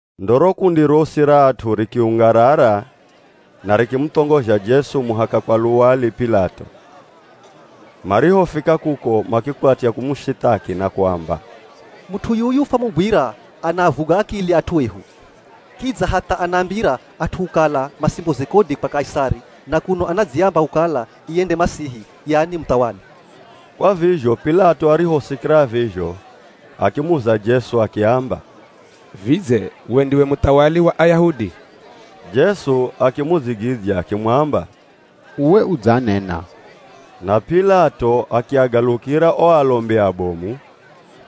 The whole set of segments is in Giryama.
Ndo ro kundi rosi ra at'u rikiungarara na rikimuthongozha Jesu muhaka kwa luwali P'ilato. Marihofika kuko, makikwatya kumushithaki na kuamba, “Mut'u yuyu fwamugwira anaavuga akili at'u ehu. Kidza hatha anaambira at'u kukala masimboze kodi kwa Kaisari na kuno anadziamba kukala iye nde ye Masihi, yani muthawali.” Kwa vizho P'ilato arihosikira vizho akimuza Jesu akiamba, “Vidze we ndiwe muthawali wa Ayahudi?” Jesu akimudzigidzya akimwamba, “Uwe udzanena.” Na P'ilato akiagalukira o alombi abomu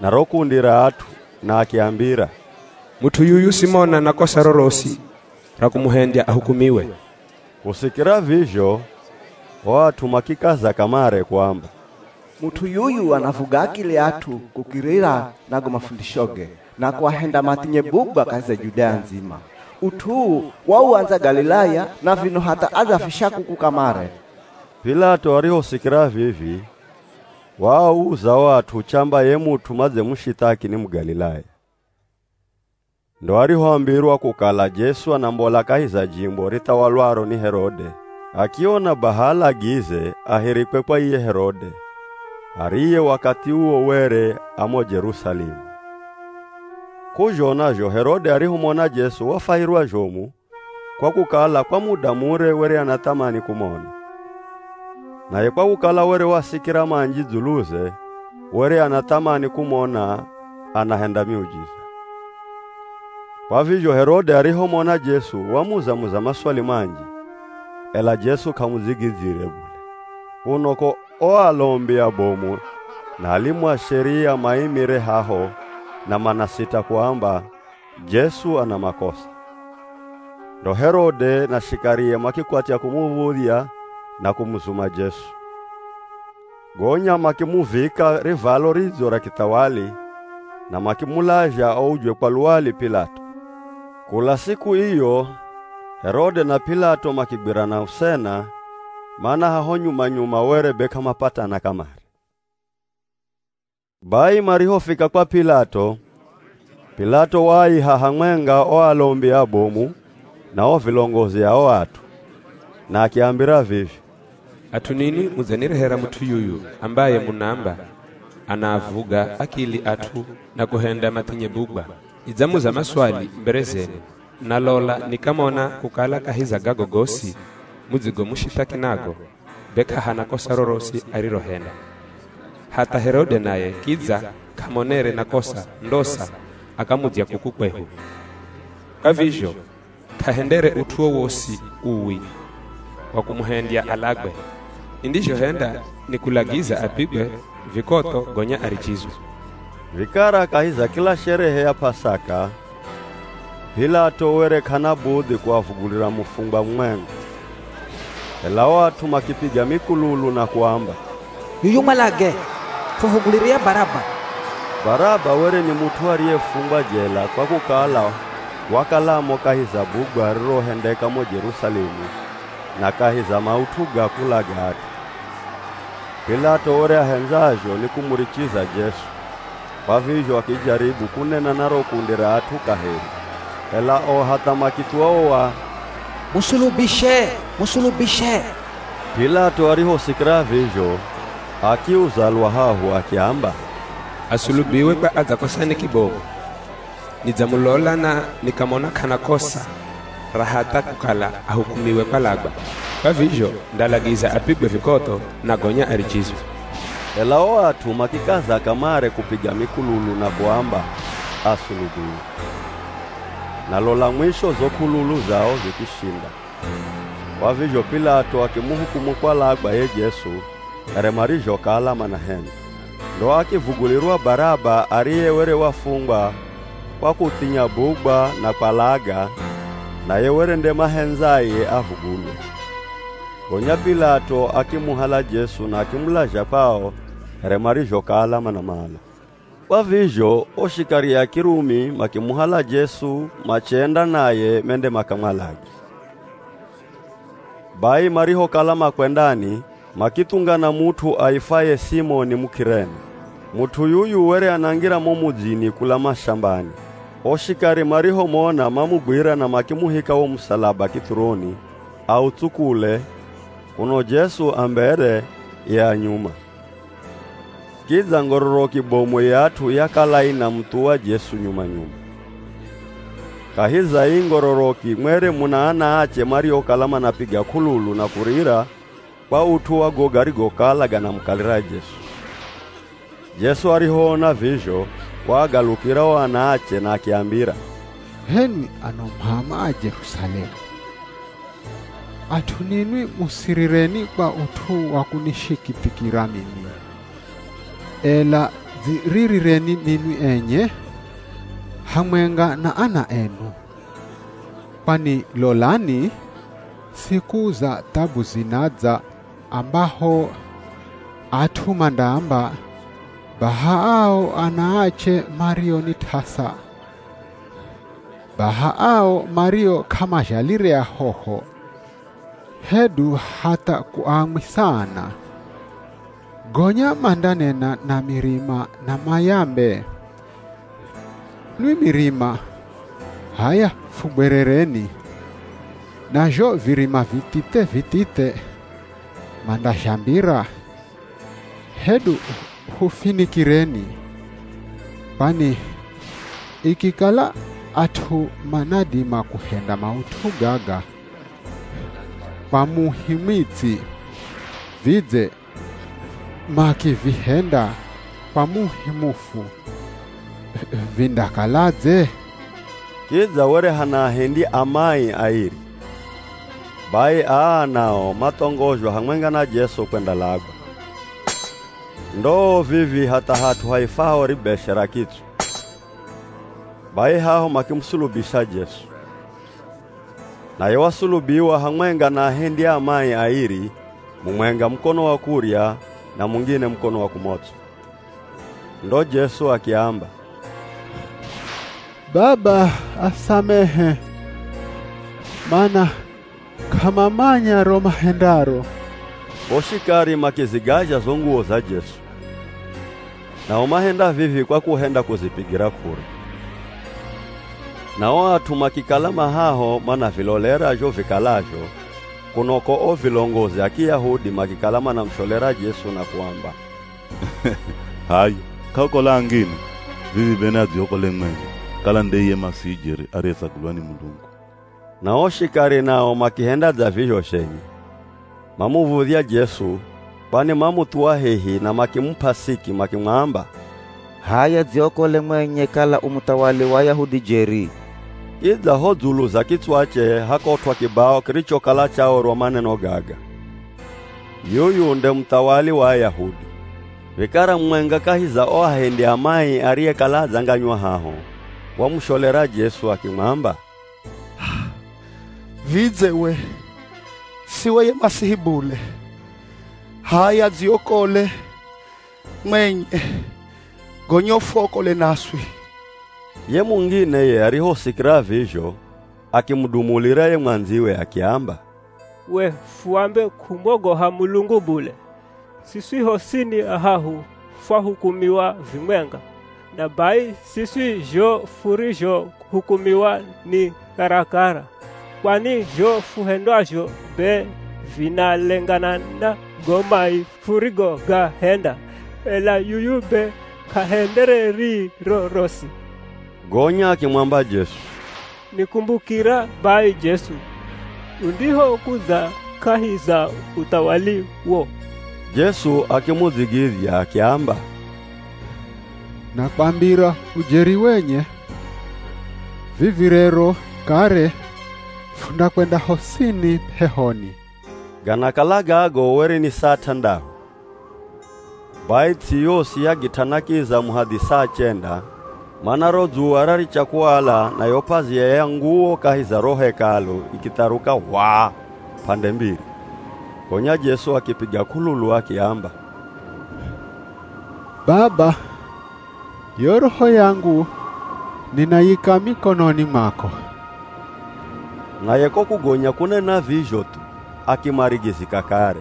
na ro kundi ra at'u na akiambira, “Mut'u yuyu simona na kosa rorosi ra kumuhendya ahukumiwe.” Kusikira vizho, o at'u makikaza kamare kuamba, “Mut'u yuyu anavuga akili at'u kukirira na go mafundishoge na kuahenda mathinye bugwa kahi za Judea ndzima. Ut'u uu wauandza Galilaya na vino hatha adzavifisha kuku kamare.” P'ilato arihosikira vivi waauza o at'u chamba ye mut'u madzemushithaki ni Mugalilaya. Ndo arihombirwa kukala Jesu anambola kahi za jimbo rithawalwaro ni Herode, akiona baha alagize ahirikwe kwa iye Herode, ariye wakathi uwo were a mo Jerusalemu. K'uzhona zho Herode arihomona Jesu wafwahirwa zhomu kwa kukala kwa muda mure were anathamani kumona. Naye kwa kukala were wasikira manji dzuluze were ana thamani kumona anahenda miujiza. Kwa vizho Herode arihomona Jesu, wamuza-muza maswali manji, ela Jesu k'amudzigidzyire bule. Kuno ko, o alombi abomu na alimu a Sheria maimire haho na manasita kuamba Jesu ana makosa. Ndo Herode na shikarie makikwatya kumuv̱udhya na kumuzuma Jesu. Gonya makimuvika rivalo ridzo ra kithawali na makimulazha aujwe kwa luwali P'ilato. Kula siku iyo Herode na P'ilato makigwirana usena, mana haho nyuma-nyuma were be k'amapatana kamare. Bai marihofika kwa P'ilato, P'ilato waaiha hamwenga o alombi abomu na o vilongozi a o at'u, na akiambira vivi, “At'u ninwi mudzanirehera mut'u yuyu ambaye munaamba anaavuga akili at'u na kuhenda mathinye bugwa. Nidzamuza maswali mbere zenu na lola nikamona kukala kahi za gago gosi mudzigomushithaki nago, be k'ahana kosa rorosi arirohenda. Hatha Herode naye kidza k'amonere na kosa ndosa akamudzya kuku kwehu. Kwa vizho k'ahendere ut'u wowosi uwi wa kumuhendya alagwe. Nindizhohenda ni kulagiza apigwe vikotho gonya arichizwe.” [ Vikara kahi za kila sherehe ya P'asaka, P'ilato were k'ana budhi kuavugulira mufungwa mumwenga.] Ela o at'u makipiga mikululu na kuamba, “Yuyu mwalage! Fuvugulire ye Baraba!” (Baraba were ni mut'u ariyefungwa jela kwa kukala wakalamo kahi za bugwa ririrohendeka mo Jerusalemu na kahi za maut'u ga kulaga at'u.) P'ilato were ahendzazho ni kumurichiza Jesu, kwa vizho akijaribu kunena na ro kundi ra at'u kaheri, ela o hatha makithuwa o wa, “Musulubishe! Musulubishe!” P'ilato arihosikira vizho akiuza lwa hahu akiamba, “Asulubiwe kwa adzakosani kibomu? Nidzamulola na nikamona k'ana kosa ra hatha kukala ahukumiwe kwalagwa, kwa vizho ndalagiza apigwe vikotho na gonya arichizwe.” Ela o at'u makikaza kamare kupiga mikululu na kuamba, asulubiwe. Na lola mwisho zo k'ululu zao zikishinda. Kwa vizho P'ilato akimuhukumu kwalagwa ye Jesu here marizhokala manahendza. Ndo akivugulirwa Baraba ariye were wafungwa kwa kuthinya bugwa na kwalaga, naye were nde mahendzaye avugulwe. Gonya P'ilato akimuhala Jesu na akimulazha kwao here marizhokala manamala. Kwa vizho o shikari a Kirumi makimuhala Jesu machenda naye mende makamwalage. Bai marihokala makwendani makithungana mut'u aifwaye Simoni Muk'irene. Mut'u yuyu were anangira mo mudzini kula mashambani. O shikari marihomona mamugwira na makimuhika wo musalaba kithuroni, autsukule, kuno Jesu a mbere ye a nyuma. Kidza ngororoki bomu ya at'u yakala inamuthuwa Jesu nyuma-nyuma. Kahi za ii ngororoki mwere muna anaache mariokala manapiga k'ululu na kurira kwa ut'u wa go garigokala ganamukalira Jesu. Jesu arihoona vizho waagalukira o anaache na akiambira, “H'enwi ano m'ama a Jerusalemu, at'u ninwi musirireni kwa ut'u wa kunishikithikira mimi, ela dziririreni ninwi enye hamwenga na ana enu. Kwani lolani siku za thabu zinadza ambaho at'u mandaamba, ‘Baha ao anaache mario ni t'asa, baha ao mario k'amazhalire ahoho, hedu hatha kuamwisa ana!’ Gonya mandanena na mirima na mayambe, ‘Nwi mirima h'aya fugwerereni!’ Na zho virima vithithe-vithithe mandazhambira, ‘Hedu hufinikireni!’ Kwani ikikala at'u manadima kuhenda maut'u gaga kwa muhi mwitsi vidze makivihenda kwa muhi mufu vindakaladze?” Kidza were hana ahendi a mai airi, bai aa nao mathongozhwa hamwenga na Jesu kwendalagwa. Ndoo vivii, hatha hat'u haifwaho Ribeshe ra Kitswa, bai haho makimusulubisha Jesu. Naye wasulubiwa hamwenga na ahendi a mai airi, mumwenga mukono wa kurya, na mungine mukono wa kumots'o. [ Ndo Jesu akiamba, “Baba asamehe! Mana k'amamanya ro mahendaro.”] O shikari makizigazha zo nguwo za Jesu. Nao mahenda vivi kwa kuhenda kuzipigira k'ura. Na o at'u makikala ma haho manavilolera zho vikalazho, kuno ko o vilongozi a Kiyahudi makikala manamusholera Jesu na kuamba, “H'aya k'aokola angine, vivi be ni adziokole mwenye kala nde iye Masihi jeri ariyetsagulwa ni Mulungu.” Na o shikari nao makihenda dza vizho zhenye mamuv̱udhya Jesu, kwani mamuthuwa hehi na makimup'a siki, makimwamba, “H'aya dziokole mwenye kala u muthawali wa Ayahudi jeri!” Kidza ho dzulu za kitswache hakotw'a kibao kirichokala chaorwa maneno gaga: Yuyu Nde Muthawali Wa Ayahudi. Vikara mumwenga kahi za o ahendi a mai ariyekala adzanganywa haho, wamusholera Jesu akimwamba, “Vidze we siwe ye Masihi bule? H'aya dziokole mwenye gonya ufuokole naswi!” Ye mungine ye arihosikira vizho akimudumulira ye mwandziwe akiamba, “We fuambe kumwogoha Mulungu bule? Siswi hosini ahahu fwahukumiwa vimwenga. Na bai siswi zho furizhohukumiwa ni karakara, kwani zho fuhendwazho be vinalengana na go mai furigogahenda, ela yuyu be k'ahendere rii rorosi.” Gonya akimwamba Jesu, “Nikumbukira bai Jesu, undihokudza kahi za uthawaliwo!” Jesu akimudzigidzya akiamba, “Nakwambira ujeri wenye, vivi rero kare fundakwenda hosini p'ehoni.” Ganakala gago were ni saa t'andahu, bai ts'i yosi yagit'ana kiza muhadhi saa chenda, mana ro dzuwa raricha kuala na yo p'azia ya nguwo kahi za ro Hekalu ikitharuka h'waa p'ande mbiri. Gonya Jesu akipiga k'ululu akiamba, “Baba, yo roho yangu ninayika mikononi mwako.” Naye ko kugonya kunena vizho thu, akimarigizika kare.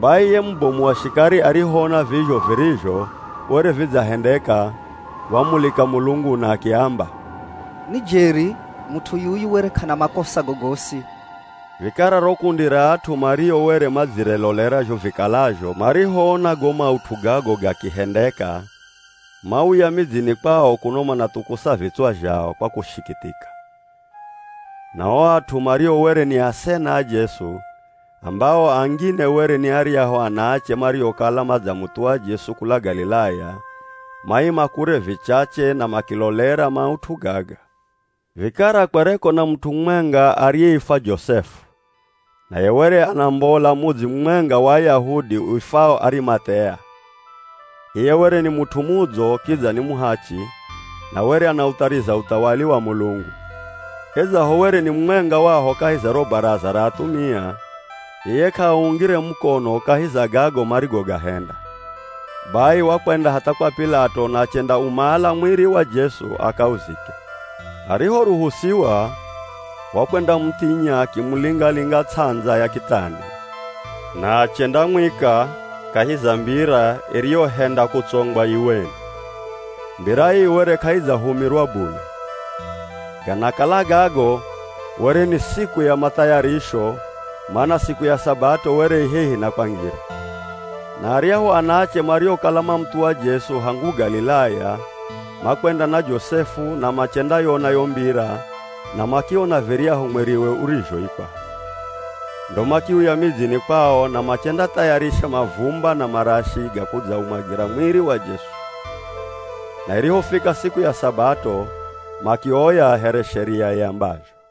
Bai ye mubomu wa shikari arihoona vizho virizho were vidzahendeka wamulika Mulungu na akiamba, “Ni jeri mut'u yuyu were k'ana makosa gogosi.” Vikara ro kundi ra at'u mario were madzirelolera zho vikalazho marihoona go maut'u gago gakihendeka, mauya midzini kwao kuno manathukusa vitswa zhao kwa kushikithika. Na o at'u mario were ni asena a Jesu, ambao angine were ni aryahu anaache mariokala madzamuthuwa Jesu kula Galilaya, maima kure vichache na makilolera maut'u gaga. Vikara kwereko na mut'u mumwenga ariyeifwa Josefu naye were anambola mudzi mumwenga wa Ayahudi uifwao Arimath'ea. Iye were ni mut'u mudzo kidza ni muhachi, na were anauthariza uthawali wa Mulungu. Idzaho were ni mumwenga waho kahi za ro Baraza ra athumia, iye k'aaungire mukono kahi za gago marigogahenda. Bai wakwenda hatha kwa P'ilato na achendaumala mwiri wa Jesu akauzike. Arihoruhusiwa wakwendamuthinya akimulinga-linga ts'andza ya kitani, na achendamwika kahi za mbira iriyohenda kutsongwa iweni. Mbira ii were k'aidzahumirwa bule. Ganakala gago were ni siku ya Mathayarisho, mana siku ya Sabato were i hehi na kwangira. Na aryahu anaache mariokala mamuthuwa Jesu hangu Galilaya, makwenda na Josefu na machendayona yo mbira na makiona viryahu mwiriwe urizhoikwa. Ndo makiuya midzini kwao na machendathayarisha mavumba na marashi ga kudzaumwagira mwiri wa Jesu. Na irihofika siku ya Sabato makioya here Sheria iambazho.